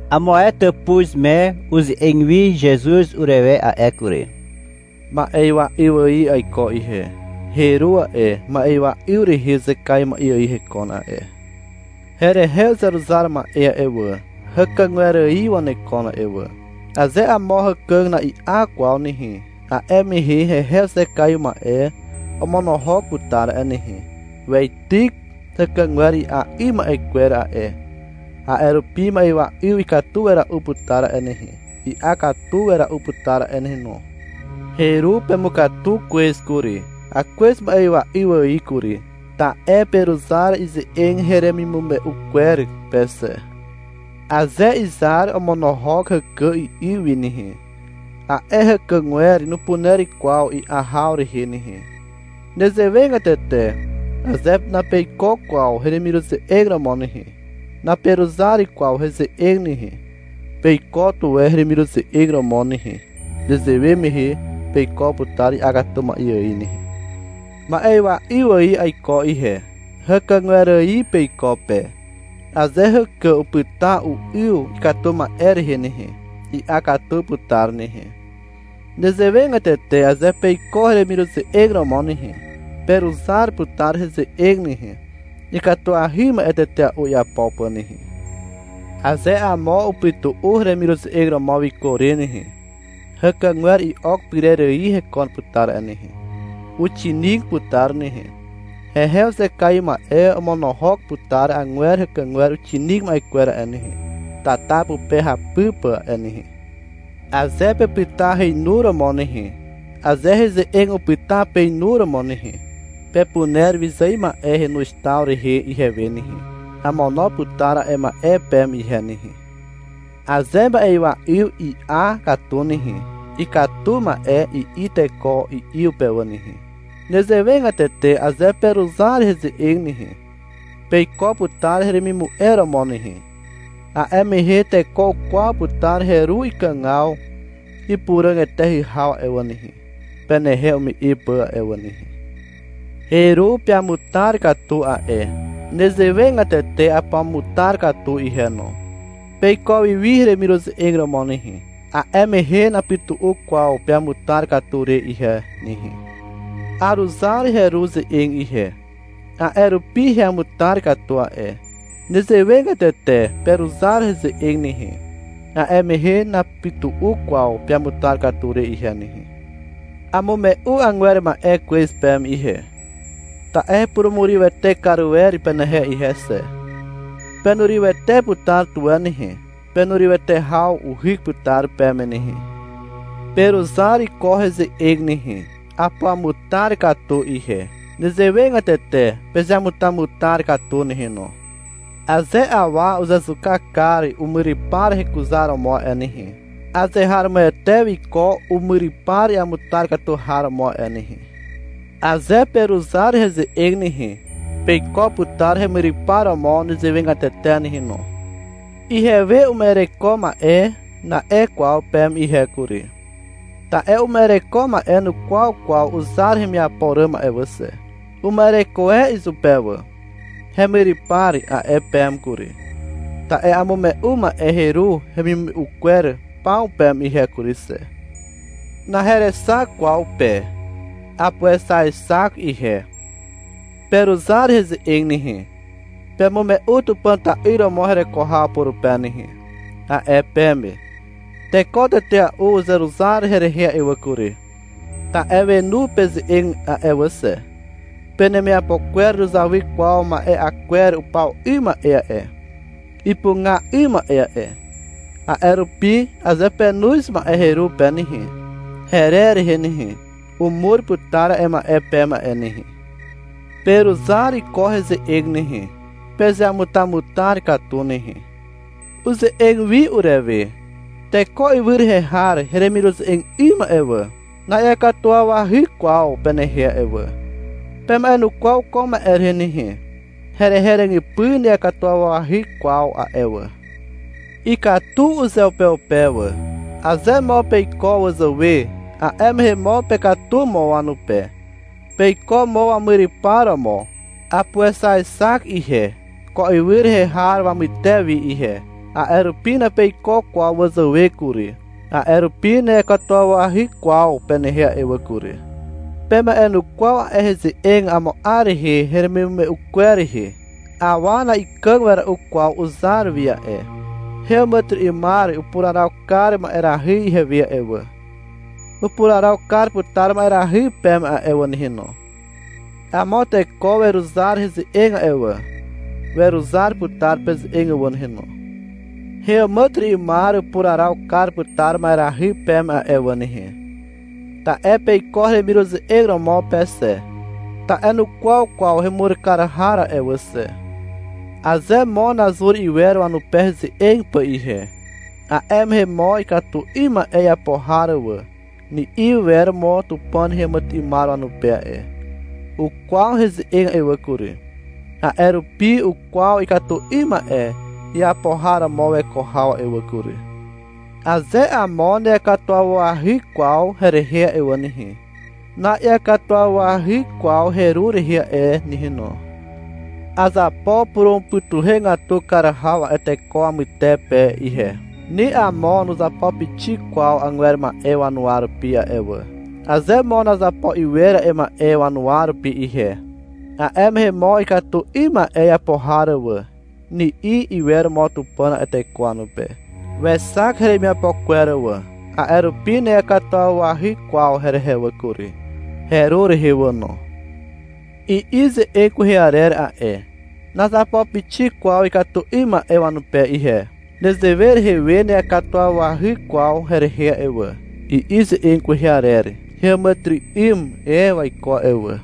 (Amo ae tàpuz me) uze'eg wi Zezuz urewe a'e kury. — Ma'ywa 'yw ài aiko ihe. Heru a'e, ma'ywa 'yw rehe uzekaiw ma'e ài hekon a'e. Herehe uzeruzar ma'e a'e wà, hàkàgwer ài wanekon a'e wà. Aze amo hàkà na'i'a kwaw nehe, a'e mehe hehe uzekaiw ma'e omonohok putar a'e nehe. Weityk hàkàgwer i'a 'ym ma'e kwer a'e. A'e rupi ma'ywa 'yw ikatu wera'u putar a'e nehe, i'a katu wera'u putar a'e nehe no. Heru pemukatu kwez kury, (akwez ma'ywa 'yw ài kury), ta'e peruzar ize'eg heremimume'u kwer pe xe. Aze izar omonohok hàkà i'yw wi nehe, a'e hàkàgwer nupuner kwaw i'a haw rehe nehe. Nezewegatete aze napeiko kwaw heremiruze'eg romo nehe, naperuzar kwaw heze'eg nehe. Peiko tuwe heremiruze'eg romo nehe. Nezewe mehe peiko putar i'a katu ma'e ài nehe. Ma'ywa 'yw ài aiko ihe. Hàkàgwer ài peiko pe. Aze hàkà upyta u'yw ikatu ma'e rehe nehe, i'a katu putar nehe. Nezewegatete aze peiko heremiruze'eg romo nehe, peruzar putar heze'eg nehe, ikatuahy ma'e tetea'u iapo pà nehe. Aze amo upytu'u heremiruze'eg romo wiko re nehe, hàkàgwer i'ok pyrer ài hekon putar a'e nehe. Uxinig putar nehe. Hehe uzekaiw ma'e omono'og putar agwer hàkàgwer uxinig ma'e kwer a'e nehe, tata pupe hapy pà a'e nehe. Aze pepyta heinuromo nehe, aze heze'eg upyta peinuromo nehe, pepuner wyzài ma'e henoz taw rehe ihewe nehe. Amono putar a'e ma'e peme ihe nehe. Aze ma'ywa 'yw i'a katu nehe, — Ikatu ma'e, i'i teko i'yw pe wà nehe. Nezewegatete aze peruzar heze'eg nehe, peiko putar heremimu'e romo nehe. A'e mehe teko ukwaw putar heru ikàgaw ipuràg eteahy haw a'e wà nehe, penehe ume'e pà a'e wà nehe. Heru peamutar katu a'e. Nezewegatete apuamutar katu ihe no. Peiko wi wi heremiruze'eg romo nehe. A'e mehe napytu'u kwaw peamutar katu re ihe nehe. Aruzar heru ze'eg ihe. A'e rupi heamutar katu a'e. Nezewegatete peruzar heze'eg nehe. A'e mehe napytu'u kwaw peamutar katu re ihe nehe. Amume'u agwer ma'e kwez peme ihe, ta'e hepurumurywete kar wer penehe ihe xe. Penurywete putar tuwe nehe. Penurywete haw uhyk putar peme nehe. Peruzar ko heze'eg nehe. Apuamutar katu ihe. Nezewegatete pezeamutamutar katu nehe no. Aze awa uzezuka kar umyrypar hekuzaromo a'e nehe, azeharomoete wiko umyrypar iamutar katu har romo a'e nehe. Aze peruzar heze'eg nehe, peiko putar hemyrypar romo nezewegatete nehe no. — Ihewe uma'ereko ma'e, na'e kwaw peme ihe kury. Ta'e uma'ereko ma'e nukwaw kwaw uzar hemiapo ràm a'e wà xe. Uma'ereko e izupe wà. — Hemyrypar, a'e peme kury. Ta'e amume'u ma'e heru hemimume'u kwer paw peme ihe kury xe. Naherexak kwaw pe. Apuexaexak ihe. — Peruzar heze'eg nehe, pemume'u Tupàn ta'yr romo hereko haw purupe nehe, a'e peme. Teko tetea'u uzeruzar herehe a'e wà kury, ta'e wenu peze'eg a'e wà xe. Penemiapo kwer nuzawy kwaw ma'e'a kwer upaw 'ym ma'e a'e, ipuga 'ym ma'e a'e. A'e rupi aze penoz ma'e heru pe nehe, herer rehe nehe, umur putar a'e ma'e peme a'e nehe. Peruzar ko heze'eg nehe. Pezeamutamutar katu nehe. Uze'eg wi urewe. — Teko ywy rehe har heremiruze'eg 'ym a'e wà, na'iakatuwawahy kwaw penehe a'e wà. Pema'enukwaw ko ma'e rehe nehe. Herehe ràgypy na'iakatuwawahy kwaw a'e wà. Ikatu uzeupeupe wà. Aze mo peiko wazàwe, a'e mehe mo pekatu mo wanupe. Peiko mo wamyrypar romo. Apuexaexak ihe, ko ywy rehe har wamyter wi ihe. A'e rupi napeiko kwaw wazàwe kury. A'e rupi na'iakatuwawahy kwaw penehe a'e wà kury. Pema'enukwaw a'e heze'eg amo 'ar mehe heremimume'u kwer rehe. Awa na'ikàg wera'u kwaw uzar wi a'e. Heàmàtyry'ymar upuraraw kar ma'erahy ihewe a'e wà. Upuraraw kar putar ma'erahy peme a'e wà nehe no. Amo teko weruzar heze'eg a'e wà. Weruzar putar peze'eg wà nehe no. Heàmàtyry'ymar upuraraw kar putar ma'erahy peme a'e wà nehe, ta'e peiko heremiruze'eg romo pe xe, ta'e nukwaw kwaw hemur kar har a'e wà xe. Aze mo nazur iwer wanupe heze'eg pà ihe, a'e mehe mo — Ikatu 'ym ma'e iapo har wà, ni'i wer mo Tupàn heàmàtyry'ymar wanupe a'e. Ukwaw heze'eg a'e wà kury, a'e rupi ukwaw ikatu 'ym ma'e iapo har romo weko haw a'e wà kury. Aze amo na'iakatuwawahy kwaw herehe a'e nehe, na'iakatuwawahy kwaw heru rehe a'e nehe no. Azapo purumupytuhegatu kar haw a'e teko wamytepe ihe. Ni amo nuzapo pixik kwaw agwer ma'e wanuwa rupi a'e wà. Aze mo nazapo iwer a'e ma'e wanuwa rupi ihe, a'e mehe mo — Ikatu 'ym ma'e iapo har wà, ni'i iwer mo Tupàn a'e teko wanupe. Wexak heremiapo kwer wà. A'e rupi na'iakatuwawahy kwaw herehe wà kury, heru rehe wà no. I'i ze'eg kwehe arer a'e. — Nazapo pixik kwaw ikatu 'ym ma'e wanupe ihe. Nezewe rehe we na'iakatuwawahy kwaw herehe a'e wà, i'i ze'eg kwehe arer. Heàmàtyry'ym e waiko a'e wà.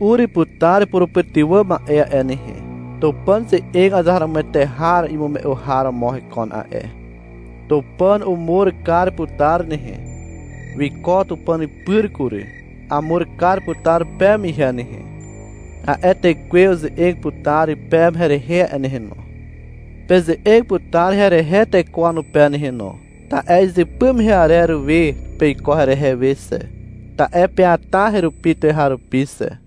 Ur putar purupytywà ma'e a'e nehe. Tupàn ze'eg azeharomoete har imume'u har romo hekon a'e. Tupàn umur kar putar nehe. Wiko Tupàn pyr kury. Amur kar putar peme ihe nehe. A'e Tekwe uze'eg putar peme herehe a'e nehe no. Peze'eg putar herehe teko wanupe nehe no, ta'e izypy mehe arer we peiko herehe we xe, ta'e peata herupi tuweharupi xe.